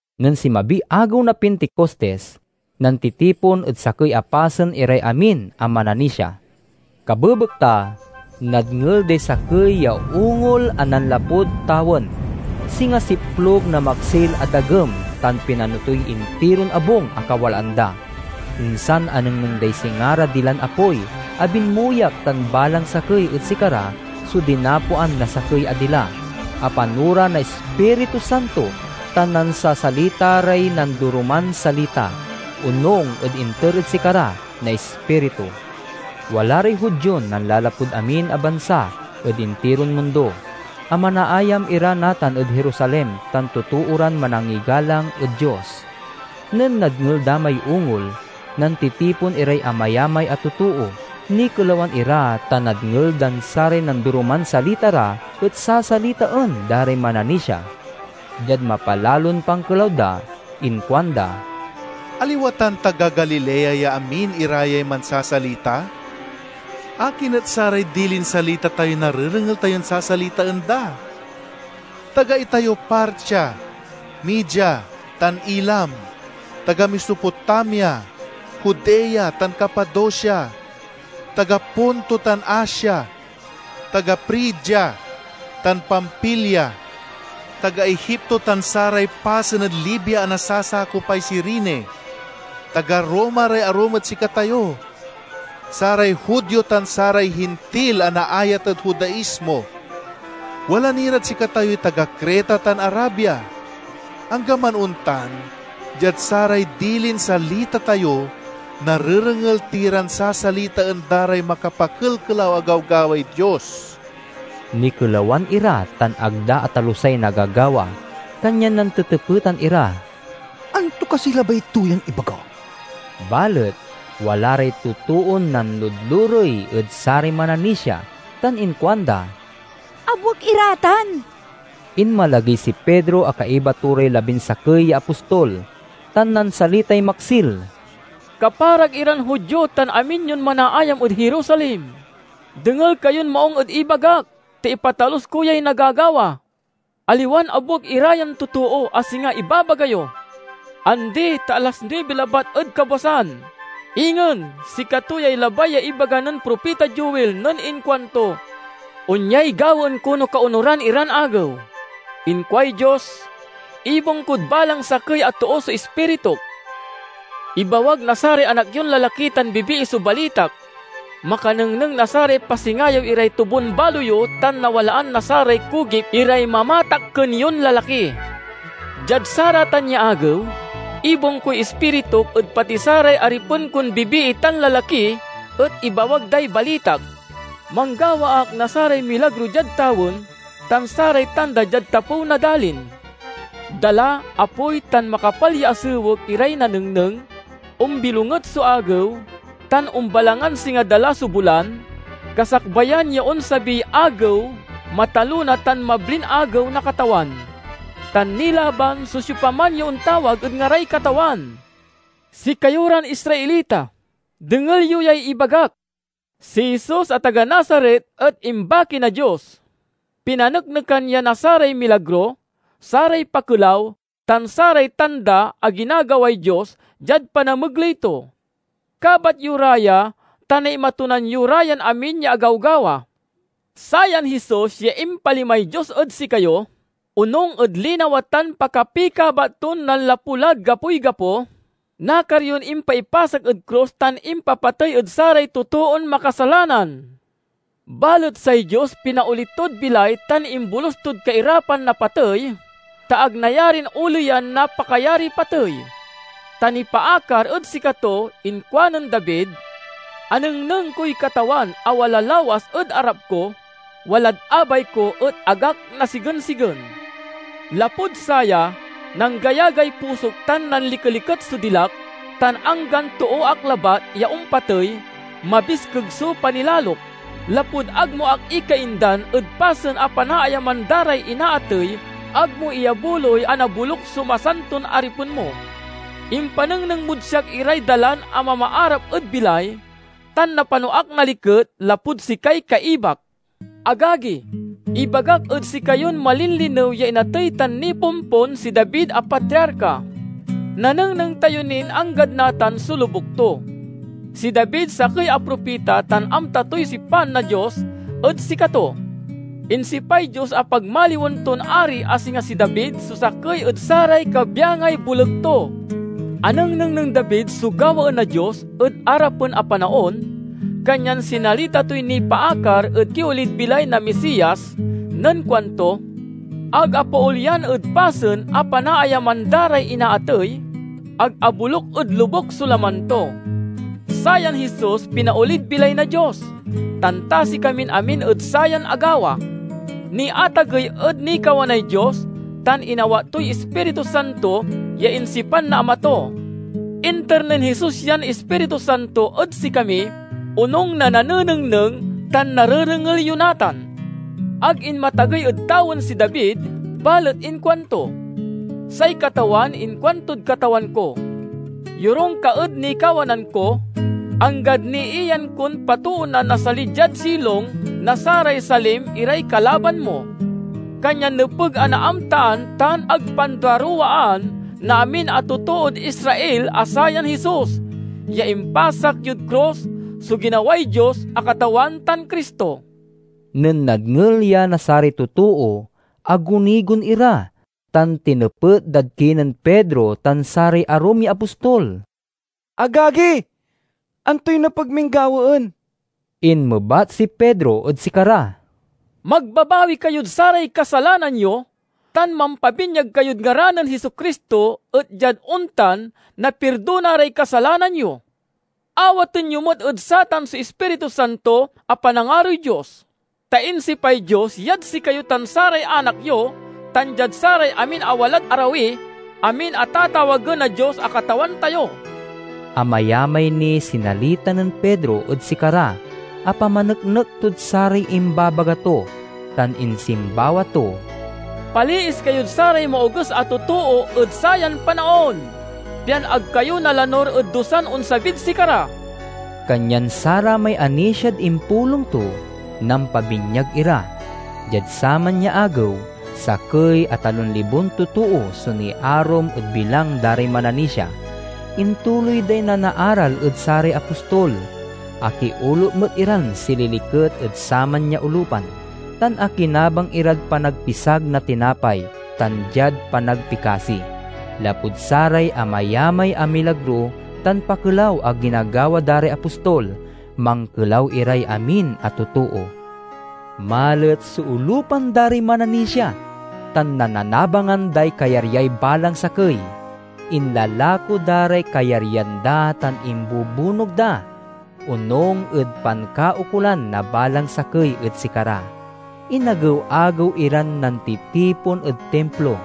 Nen sinmabiy agew na Pinticostis, nantitipon ed sakey a pasen iray amin a mananisia. Kabebekta, nadngel day sakey ya ungol a nanlapud tawen. Singa siplug na maksil a dagem, tan pinano toy intiron abung a kawalaan da. Insan anengneng day singa ra dilan apoy a binmuyak tan balang sakey ed sikara so dinapoan na sakey a dila. Apano ra na Ispiritu Santo tan nansasalita ray nandoroman salita, onung ed inter ed sikara na Ispiritu. Wala ray Judion nanlalapud amin a bansa ed intiron mundo, a manaayam ira natan ed Jerusalem tan totoo ran manangigalang ed Dios. Nen nadngel da may ungol, nantitipon iray amayamay a totoo. Nikelawan ira, ta nadngel dan saray nandoroman salita ra et sasalitaen da ray mananisia. Diad mapalalon pankelaw da inkuanda, "Aliwa tan taga Galilea ya amin ira yay mansasalita? Akin et saray dilin salita tayoy narerengel tayon sasalitaen da? Taga itayo Partia, Media, tan Elam; taga Mesopotamia, Judea, tan Capadocia, taga Ponto tan Asia; taga Frigia tan Pamfilia, taga Egipto tan saray pasen ed Libia a nasasakopay Cirene, taga Roma ray arum ed sikatayo: saray Judio tan saray Hintil a naayat ed Judaismo. Wala ni rad sikatayoy taga Creta tan Arabia. Anggaman ontan, diad saray dilin salita tayo, narerengel ti ran sasalitaen da ray makapakelkelaw a gawgaway Dios!" Nikelawan ira tan ag da atalusay nagagawa, kanyan nantetepetan ira, "Anto kasiy labay to yan ibaga?" Balet wala ray totoon nanludlurey ed saray mananisia tan inkuanda, "Abuek ira tan!" Inmalagey si Pedro a kaiba to ray labinsakey ya apostol, tan nansalitay maksil, "Kaparak iran Judio tan amin yon manaayam ed Jerusalem, dengel kayon maung ed ibagak, ta ipatalus ko yay nagagawa. Aliwan abuek ira yan totoo, a singa ibabaga yo. Andi, ta alas nuibi labat ed kabwasan. Ingen, sikato yay labay ya ibaga nen propita Joel nen inkuanto, 'Onyay gawaen ko no kaonuran iran agew, inkuay Dios: ibung kod balang sakey a too so Ispirituk. Ibawag na saray anak yon lalaki tan bibii so balitak; makanengneng na saray pasingayew iray tobun-balo yo tan nawalaan na saray kugip iray mamatakken yon lalaki. Diad saratan ya agew, ibung koy Ispirituk ed pati saray aripen kon bibii tan lalaki, et ibawag day balitak. Manggawa ak na saray milagro diad tawen, tan saray tanda diad tapew na dalin. Dala, apoy, tan makapal ya asewek iray nanengneng, ombilonget so agew, tan ombalangan singa dala so bulan, kasakbayan ya onsabiy Agew matalona tan mablin Agew na Katawan. Tan nilaban so siopaman ya ontawag ed ngaray Katawan.' "Sikayo ran Israelita, dengel yo yay ibagak! Si Jesus a taga Nazaret et imbaki na Dios. Pinaneknekan ya na saray milagro, saray pakelaw, tan saray tanda a ginagaway Dios diad panamegley to. Kabat yo ra ya, ta naimatunan yo ra yan amin ya agawgawa. Sayan Jesus ya impalimay Dios ed sikayo, onung ed linawa tan pakapikabat ton nanlapu lad gapoy gapo, nakar yon impaipasak ed krus tan impapatey ed saray totoon makasalanan. Balet say Dios pinaoli tod bilay tan imbolus tod kairapan na patey, ta ag nayarin oleyan na pakayariy patey. Ta, nipaakar ed sikato, inkuanen David, 'Anengneng koy Katawan a wala lawas ed arap ko; walad abay ko, et ag ak nasigensigen. Lapud saya, nanggayagay pusok tan nanlikeliket so dilak; tan anggan too ak labat ya ompatey, mabiskeg so panilalok, lapud ag mo ak ikaindan ed pasen a panaayaman da ray inaatey ag mo iyabuloy a naboluk so masanton aripen mo. Impanengneng mod siak iray dalan a mamaarap ed bilay, tan napano ak na liket, lapud sikay kaibak!' "Agagi, ibagak ed sikayon malinlinew ya inatey tan nipompon si David a patriarka. Nanengneng tayo nin anggad natan so lobuk to. Si David sakey a propita tan amta toy sipan na Dios ed sikato. Insipay Dios a pagmaliwen ton ari a singa si David so sakey ed saray kabyangay boleg to. Anengneng nen David so gawaen na Dios ed arapen a panaon, kanyan sinalita toy nipaakar ed kiolid bilay na Misias nen kuanto: 'Ag apaolyan ed pasen a panaayaman da ray inaatey; ag aboluk ed lobuk so laman to.' Sayan Jesus pinaolid bilay na Dios, tan tasi kamin amin ed sayan agawa. Niatagey ed nikawanay Dios, tan inawat toy Ispiritu Santo ya insipan na Ama to. Inter nen Jesus yan Ispiritu Santo ed sikami, onung na nanenengneng tan narerengel yo natan. Ag inmatagey ed tawen si David, balet inkuanto, 'Say Katawan inkuantod Katawan ko: Yorung ka ed nikawanan ko, anggad niiyan kon patoonan na sali diad silong na saray salim iray kalaban mo.' "Kanyan nepeg a naamtaan tan ag panduaruwaan na amin a totood Israel a sayan Jesus ya impasak yod krus so ginaway Dios a Katawan tan Cristo!" Nen nadngel ya na saray totoo, agunigon ira, tan tinepet dad kinen Pedro tan saray arum ya apostol, "Agagi, antoy nepeg min gawaen?" Inmebat si Pedro ed sikara, "Magbabawi kayod saray kasalanan yo, tan mampabinyag kayod ngaran nen Jesu-Cristo, et diad ontan, napirdona ray kasalanan yo. Awaten yo met ed satan so Ispiritu Santo a panangaroy Dios. Ta insipay Dios yad sikayo tan saray anak yo, tan diad saray amin a walad arawi—amin a tatawagen na Dios a Katawan tayo." Amayamay niy sinalita nen Pedro ed sikara a pamaneknek tod saray imbabaga to, tan insimbawa to, "Paliis kayod saray maoges a totoo ed sayan panaon, pian ag kayo nalanur ed dusan onsabid sikara!" Kanyan saramay anisiad impulong to, nampabinyag ira. Diad saman ya agew, sakey a talon libon totoo so niarum ed bilang da ray mananisia. Intuloy day nanaaral ed saray apostol. Akiolup met iran sililiket ed saman ya olupan, tan akinabang irad panagpisag na tinapay, tan diad panagpikasi. Lapud saray amayamay a milagro tan pakelaw a ginagawa da ray apostol, mankelaw iray amin a totoo. Malet so olupan da ray mananisia, tan nannanabangan day kayaryay balang sakey. Inlalako da ray kayaryan da tan imbubunog da, onung ed pankaukolan na balang sakey ed sikara. Inagew-agew iran nantitipon ed Timplo,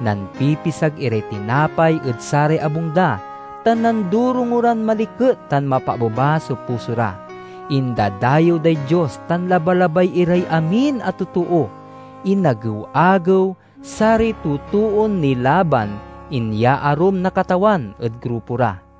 nampipisag iray tinapay ed saray abung da, tan nandorongo ran maliket tan mapaabeba so puso ra. Indadayew day Dios tan labalabay iray amin a totoo. Inagew-agew, saray totoon nilaban inyaarum na Katawan ed grupo ra.